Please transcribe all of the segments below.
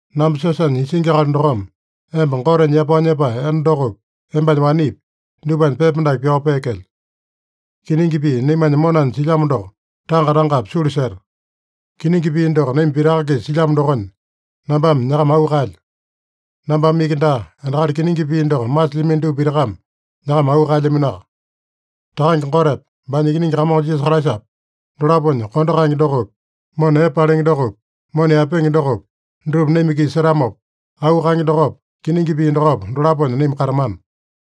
Namba siosanya isingi akali dokome emba Gotenya yapao nyepae enda dokopi, embanya wanepi, dupanya pepa dake pyao peekelyo. Kiningi pii naimanya monanya silyamo doko tanga-tangapi sulu seta. Kiningi pii doko naima pitaka-kisa silyamo dokonya, nambame nyakama auu kaelyo. Nambame iki daa, endakali kiningi pii doko masilyamino dupa pitakame nyakama auu kaelyaminoaka. Takange Gotepa, baanya Ikiningi Kamongo Jisasa Kraisapa, dolaponya kondo kaenge dokopi, mona epe palenge dokopi, mona yaepenge dokopi, dutupa naima-kisa setamopa, auu kaenge dokopa, kiningi pii dokopa, dolaponya naima katamana.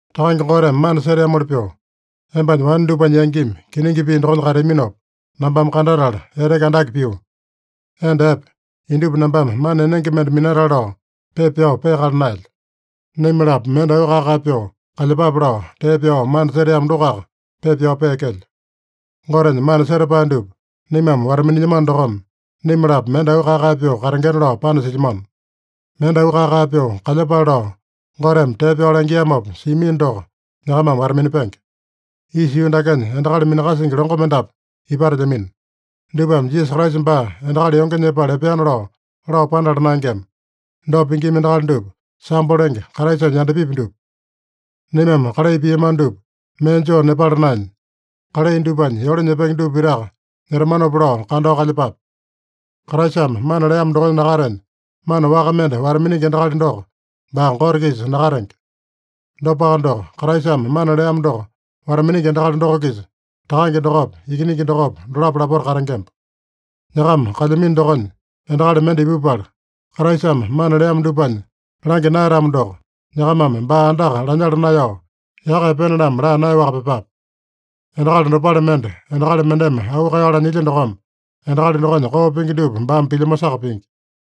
Takange Goteme mana seteamoli pyoo, embanya wane dupanya yangimi kiningi pii dokonya kateaminopa nambame kandatala, eteke andake pio. Enda epe, indupa nambame mana enenge mende minatale lao pepa pyao peakala naelyo. Naima-lapo mende auu kae-kae pyoo kalyepape lao, tee pyao mana seteamo dokoaka pepa pyao peekelyo. Gotenya mana setapae dupa naimame wata-minilyamano dokome, naima-lapo mende auu kae-kae pyoo katengena lao panasilyamano. Mende auu kae-kae pyoo kalyepale lao, Goteme tee pyao langiamopa siamino doko, nyakamame wata-minapenge. Isa yuu dakenya endakali minakasingi longo mendapu ipatelyamino. Dupame Jisasa Kraisa baa endakali yonge nyepala epeana lao, lao panala naengema. Dopa pingima endakali dupa, sambo lenge, Kraisanya yandapipi dupa. Naimame kalai piamano dupa mee joo nepala naenya, kalai dupanya yole nyepenge dupa pitaka nyetamanopa lao kandao kalyepape. Kraisame mana leamo dokonya nakatenya, mana waka mende wata-miningi endakali doko, baa Gote-kisa nakatenge. Dopaka doko, Kraisame mana leamo doko wata-miningi endakali doko-kisa Takange dokopa, Ikiningi dokopa, dolapo lapota katengemba. Nyakama kalyamino dokonya endakali mende ipupala, Kraisame mana leamo dupanya langya naeyatamo doko, nyakamame baa andaka lanyala naeyao, yaka epene-lamo laa naeyaowaka pyepape. Endakali dopale mende endakali mendeme auu kaeyao lanyilya dokome, endakali dokonya koo pingi dupa baame pilyamosaka pingi.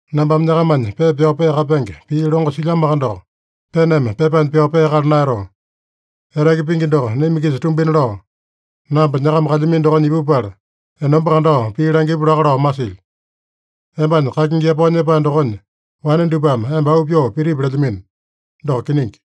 Nambame nyakamanya pepa pyao peakapenge pii longo silyamoaka doko, peneme pepanya pyao peakala naeyatoo. Eteke pingi doko naima-kisa tumbina lao, namba nyakama kalyamino dokonya ipupala, enomba kandao pii langipu laka lao masilyo. Embanya kakingi yapao nyepae dokonya wane dupame emba auu pyoo pitipi lelyamino. Doko kiningi.